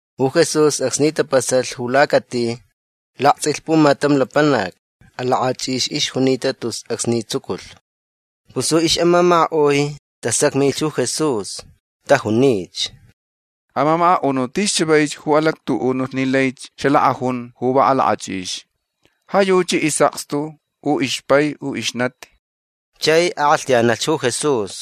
Ju Jesús acsni tapasalh ju lacati laktsʼilh pumatam lapanac. Alakʼachʼix ixjunita tus acsni tsuculh. Pus ju ixʼamamakaʼui tasacmilh ju Jesús. Tajunich: ―Amamakaʼunuʼ tis chavaich ju alactuʼunulh ni laich xalakʼajun ju va alakʼachʼix. Ja yuchi isʼakstu u ixpai u ixnati. Chai akʼalhtayanalh ju Jesús: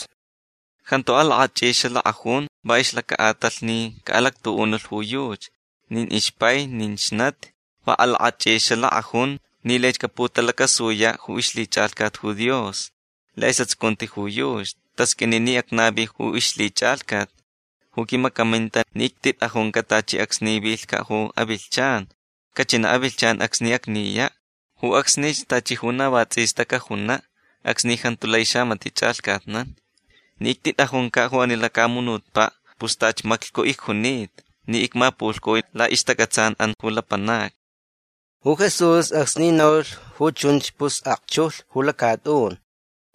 ―Jantu alakʼachʼix xalakʼajun va ixlacaʼatalh ni caʼalactuʼunulh ju yuchi nin ixpai nin ixnati. Va alakʼachʼix xalakʼajun ni laich caputalacasuyaʼ ju ixlhichʼalhcat ju Dios laʼisʼatsucunti ju yuchi. Tasqʼuini ni acnavi ju ixlhichʼalhcat ju quimacaminta ni ictitʼajuncaʼ tachi acsni vilhcaʼ ju avilhchan. Cachinaʼ avilhchan acsni acniyaʼ. Ju acsnich tachi ju na va tsʼista cajunaʼ acsni jantu lai xamatiʼ chʼalhcatnan. Ni ictitʼajuncaʼ ju ani lacamunutpaʼ pus tachi maclhcu icjunita ni icmapulhcui laʼixtacʼatsanʼan ju lapanacni. Ju Jesús acsni naulh ju chunch pus akchujlh ju lacatʼun.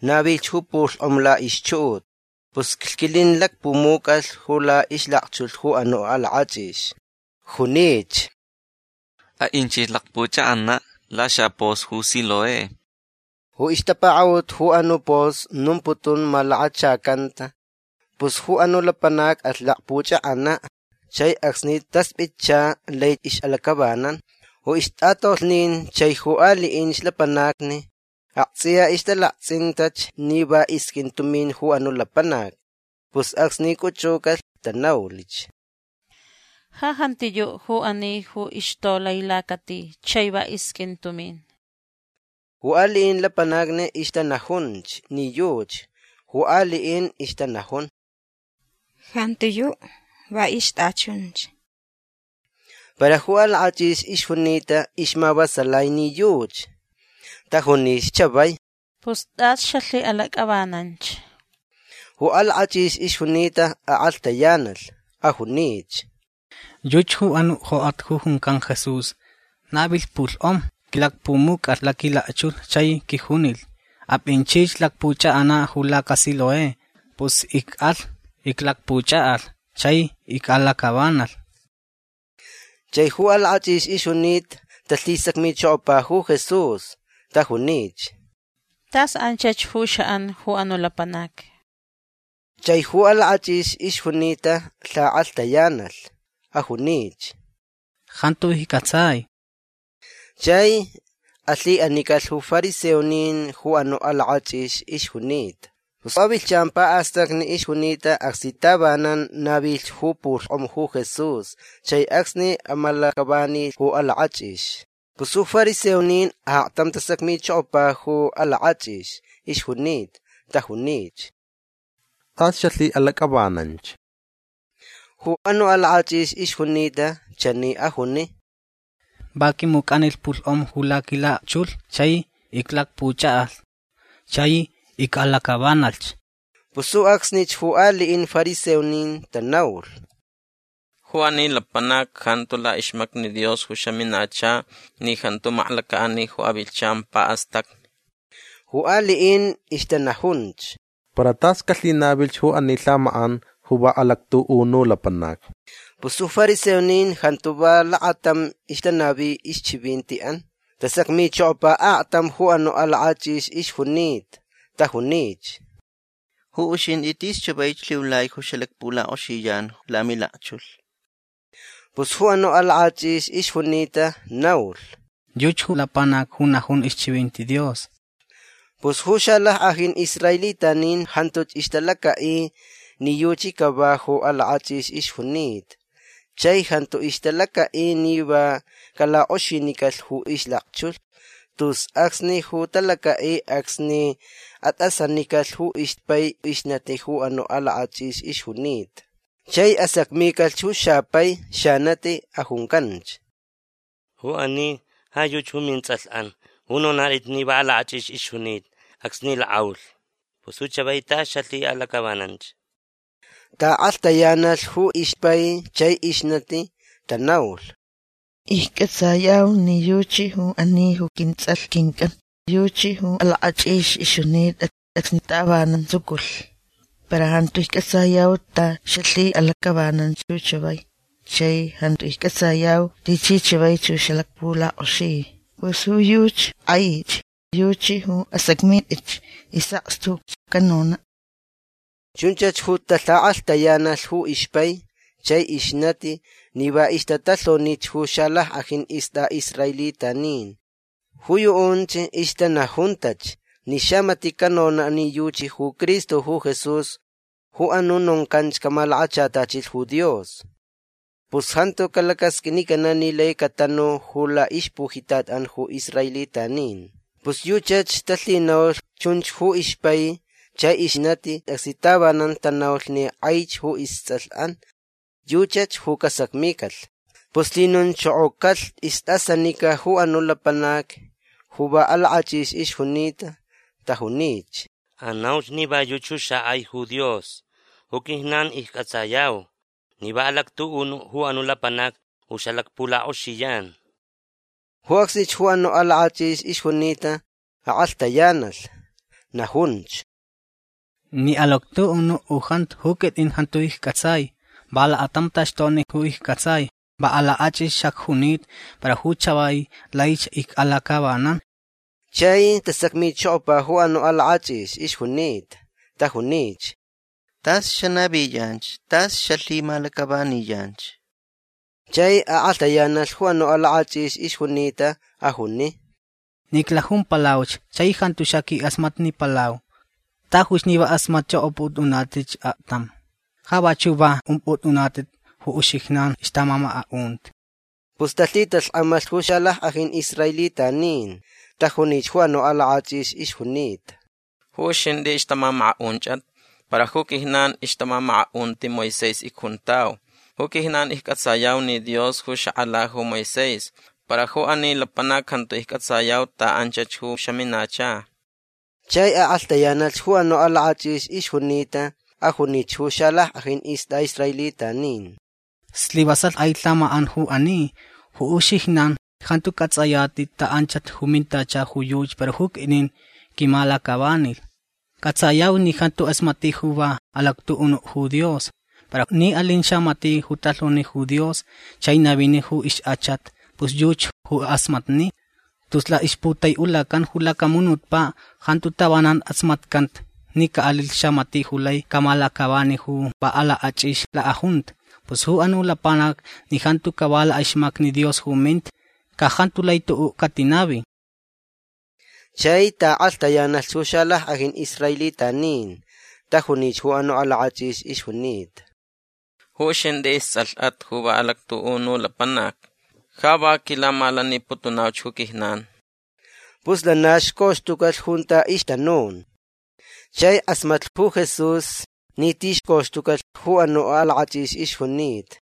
Navilh ju pulhkʼom laʼixchuʼut. Pus lhquilin lacpumucʼalh ju laʼixlakchulh ju anuʼ alakʼachʼix. Junich: ―Aʼinchich lakpʼuchʼakʼanaʼ laxapos ju Siloé. Ju ixtapakaʼut ju anuʼ pos nomputun Malakachacanta. Pus ju anuʼ lapanac alh lakpuchʼakʼanaʼ. Chai acsni taspʼitcha lai ixʼalacʼavanan. Ju ixtʼatolhnin chai ju aliʼinch lapanacni aktsʼiya ixtalaktsʼintach ni va isqʼuin tumin ju anuʼ lapanac. Pus acsni cʼuchʼucalh tanaulich: ―Ja jantiyuʼ ju ani ju ixtolai lacati chai va isqʼuin tumin. Ju aliʼin lapanacni ixtanajunch ni yuchi. Ju aliʼin ixtanajun: ―Jantiyuʼ. Va ixtʼachunch. Para ju alakʼachʼix ixjunita ixmavasalai ni yuchi. Tajunich chavai: ―Pus tʼas xalhiʼalacʼavananch. Ju alakʼachʼix ixjunita akʼalhtayanalh. Ajunich: ―Yuchi ju anuʼ jokʼat ju juncan Jesús navilh pulhkʼom. Quilacpumucʼalh laquilakchulh chai quijunilh: “Apʼinchich lakpʼuchʼakʼanaʼ ju lacaSiloé”. Pus icʼalh. Iclakpuchʼakʼalh. Chai icʼalacʼavanalh. Chai ju alakʼachʼix ixjunita talhisacmichokopa ju Jesús. Tajunich: ―Tas anchach ju xaʼan ju anuʼ lapanac. Chai ju alakʼachʼix ixjunita lhakʼalhtayanalh. Ajunich: ―Jantu iccʼatsai. Chai alhiʼanicalh ju fariseonin ju anuʼ alakʼachʼix ixjunita. Pus avilhchan paʼastacni ixjunita acsni tavanan navilh ju pulhkʼom ju Jesús chai acsni amalacʼavanilh ju alakʼachʼix. Pus ju fariseonin aktam tasacmichokopa ju alakʼachʼix ixjunita. Tajunich: ―Tʼas xalhiʼalacʼavananch. Ju anuʼ alakʼachʼix ixjunita chani ajuni: ―Va quimucʼanilh pulhkʼom ju laquilakchulh chai iclakpuchʼakʼalh. Chai icʼalacʼavanalhch. Pus ju acsnich ju aliʼin fariseonin tanaulh: ―Ju ani lapanac jantu laʼixmacni Dios ju xaminacha ni jantu maklacaʼani ju avilhchan paʼastacni. Ju aliʼin ixtanajunch: ―Para tas calhinavilhch ju ani lhamakʼan ju va alactuʼunu lapanac. Pus ju fariseonin jantu va lakatam ixtanavi ixchivintiʼan. Tasacmichokopa aktam ju anuʼ alakʼachʼix ixjunita. Tajunich: ―Ju uxintʼi tis chavaich lhiulai ju xalakpulakʼoxiyan lamilakchulh. Pus ju anuʼ alakʼachʼix ixjunita naulh: ―Yuchi ju lapanac ju najun ixchivinti Dios. Pus ju xalackʼajin israelitanin jantuch ixtalacaʼi ni yuchi cava ju alakʼachʼix ixjunita. Chai jantu ixtalacaʼi ni va calakʼoxinicalh ju ixlakchulh. Tus acsni ju talacaʼi acsni atʼasanicalh ju ixpai ixnati ju anuʼ alakʼachʼix ixjunita. Chai asacmicalh ju xapai xanati. Ajuncanch: ―Ju ani ja yuchi ju mintsʼalhʼan ju nonatʼit ni va alakʼachʼix ixjunita acsni lakʼaulh. Pus ju chavai tas xalhiʼalacʼavananch. Taʼakʼalhtayanalh ju ixpai chai ixnati. Tanaulh: ―Iccʼatsayau ni yuchi ju ani ju quintsʼalh quincʼan. Yuchi ju alakʼachʼix ixjunita acsni tavanan tsuculh. Para jantu iccʼatsayau ta xalhiʼalacʼavananch ju chavai. Chai jantu iccʼatsayau tichi chavaich ju xalakpulakʼoxi. Pus ju yuchi kʼaich. Yuchi ju asacmitʼitch. Isʼakstuch canonaʼ. Chunchach ju talhakʼalhtayanalh ju ixpai chai ixnati ni va ixtatalhonich ju xalackʼajin istʼaʼisraelitanin. Ju yuʼunch ixtanajuntach ni xamatiʼ canonaʼ ni yuchi ju Cristo ju Jesús ju anuʼ noncanch camalakachatachilh ju Dios pus jantu calacasqʼuinicanaʼ ni lai catanu ju laʼixpujitatʼan ju israelitanin. Pus yuchach talhinaulh chunch ju ixpai chai ixnati acsni tavanan tanaulh ni kʼaich ju istsʼalhʼan. Yuchach ju casacmicalh. Pus lhinonchokocalh istʼasanica ju anuʼ lapanac ju va alakʼachʼix ixjunita. Tajunich: ―Anauch ni va yuchi ju xakʼai ju Dios. Ju quijnan iccʼatsayau ni va alactuʼunuʼ ju anuʼ lapanac ju xalakpulakʼoxiyan. Ju acsnich ju anuʼ alakʼachʼix ixjunita akʼalhtayanalh. Najunch: ―Ni alactuʼunuʼ u jantu ju quitʼin jantu iccʼatsai. Va lakatam taxtokni ju iccʼatsai. Va alakʼachʼix xacjunita. Para ju chavai laich icʼalacʼavanan. Chai tasacmichokopa ju anuʼ alakʼachʼix ixjunita. Tajunich: ―Tas xanaviyanch. Tas xalhimalacʼavaniyanch. Chai akʼalhtayanalh ju anuʼ alakʼachʼix ixjunita. Ajuni: ―Ni iclajumpalauch chai jantu xaquilakʼasmatnipalau. Tajuch ni va kʼasmatchʼokʼopʼutʼunatʼitch aktam. Ja vachuʼ va umpʼutʼunatʼit ju uxijnan ixtamamakaʼunti. Pus talhitalhkʼamalh ju xalackʼajin israelitanin. Tajunich ju anuʼ alakʼachʼix ixjunita: ―Ju uxintʼi ixtamamakaʼunchʼat. Para ju quijnan ixtamamakaʼunti Moisés icjuntau. Ju quijnan iccʼatsayau ni Dios ju xakʼala ju Moisés. Para ju ani lapanac jantu iccʼatsayau ta anchach ju xaminacha. Chai akʼalhtayanalh ju anuʼ alakʼachʼix ixjunita. Ajunich ju xalackʼajin istʼaʼisraelitanin: ―Slivasalh kʼai lhamakʼan ju ani. Ju uxijnan jantu cʼatsʼayatʼit ta anchach ju mintacha ju yuchi para ju quitʼin quimalacʼavanilh. Cʼatsayauch ni jantu kʼasmatni ju va alactuʼunuʼ ju Dios. Para ni alin xamatiʼ ju talhoni ju Dios chai navini ju ixkʼachat pus yuchi ju kʼasmatni. Tus laʼixputaiʼulacan ju lacamunutpaʼ jantu tavanan kʼasmatcanta ni caʼalilh xamatiʼ ju lai camalacʼavani ju va alakʼachʼix lakʼajunta. Pus ju anuʼ lapanac ni jantu cava laʼixmacni Dios ju minta ca jantu lai tuʼuʼ catinavi. Chai taʼakʼalhtayanalh ju xalackʼajin israelitanin. Tajunich ju anuʼ alakʼachʼix ixjunita: ―Ju uxintʼi istsʼalhʼat ju va alactuʼunu lapanacni. Ja va quilamalaniputunauch ju quijnan. Pus lana xcoxtucalh junta ixtanun. Chai kʼasmatlh ju Jesús ni tixcoxtucalh ju anuʼ alakʼachʼix ixjunita.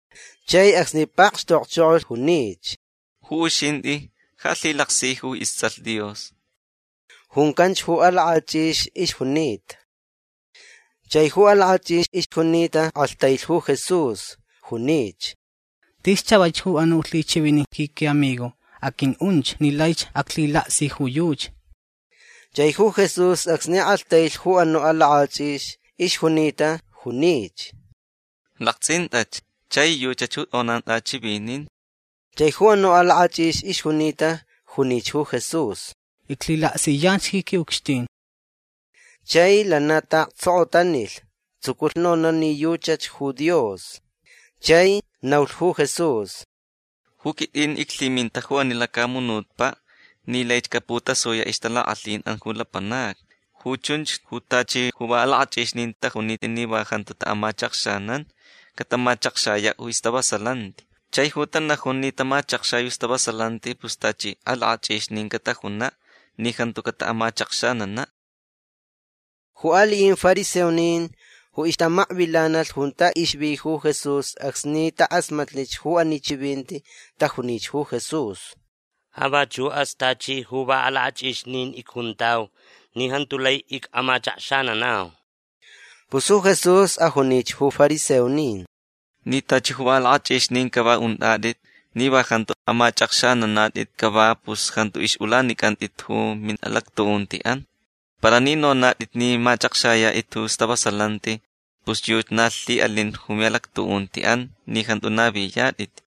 Chai acsni pakxtokchokolh junich: ―Ju uxintʼi ja lhilaksi ju istsʼalh Dios. ―Juncanch ju alakʼachʼix ixjunita. Chai ju alakʼachʼix ixjunita kʼalhtailh ju Jesús. Junich: ―Tis chavaich ju anuʼ lhichʼivinin ji quiʼamigo. Aqʼuiʼunch ni laich aclhilaksi ju yuchi. Chai ju Jesús acsni kʼalhtailh ju anuʼ alakʼachʼix ixjunita junich: ―Laktsʼintʼach. Chai yuchach ju tʼonan tʼachivinin. Chai ju anuʼ alakʼachʼix ixjunita junich ju Jesús: ―Iclhilaksiyanch ji quiʼucxtin. Chai lana taʼaktsokotanilh. Tsuculh nonaʼ ni yuchach ju Dios. Chai naulh ju Jesús: ―Ju quitʼin iclhiminta ju ani lacamunutpaʼ ni laich caputasuyaʼ ixtalakʼalhinʼan ju lapanacni. Ju chunch ju tachi ju va alakʼachʼixnin tajunita ni va jantu amachakxanan catamachakxayaʼ ju stavasalanti. Chai ju tanajun ni tamachakxai ju stavasalanti pus tachi alakʼachʼixnin catajunaʼ ni jantu cataʼamachakxananaʼ. Ju aliʼin fariseonin ju ixtamakvilanalh junta ixvi ju Jesús acsni takʼasmatnilh ju ani chivinti tajunich ju Jesús: ―Ja vachuʼas tachi ju va alakʼachʼixnin icjuntau ni jantu lai icʼamachakxananau. Pus ju Jesús ajunich ju fariseonin: ―Ni tachi ju va alakʼachʼixnin cava untʼatʼit ni va jantu amachʼakxananatʼit cava pus jantu ixʼulanicʼantʼatʼit ju miʼalactuʼuntiʼan. Para ni nonatʼit ni machʼakxayatʼit ju stavasalanti pus yuchi na lhiʼalin ju miʼalactuʼuntiʼan ni jantu naviyatʼit.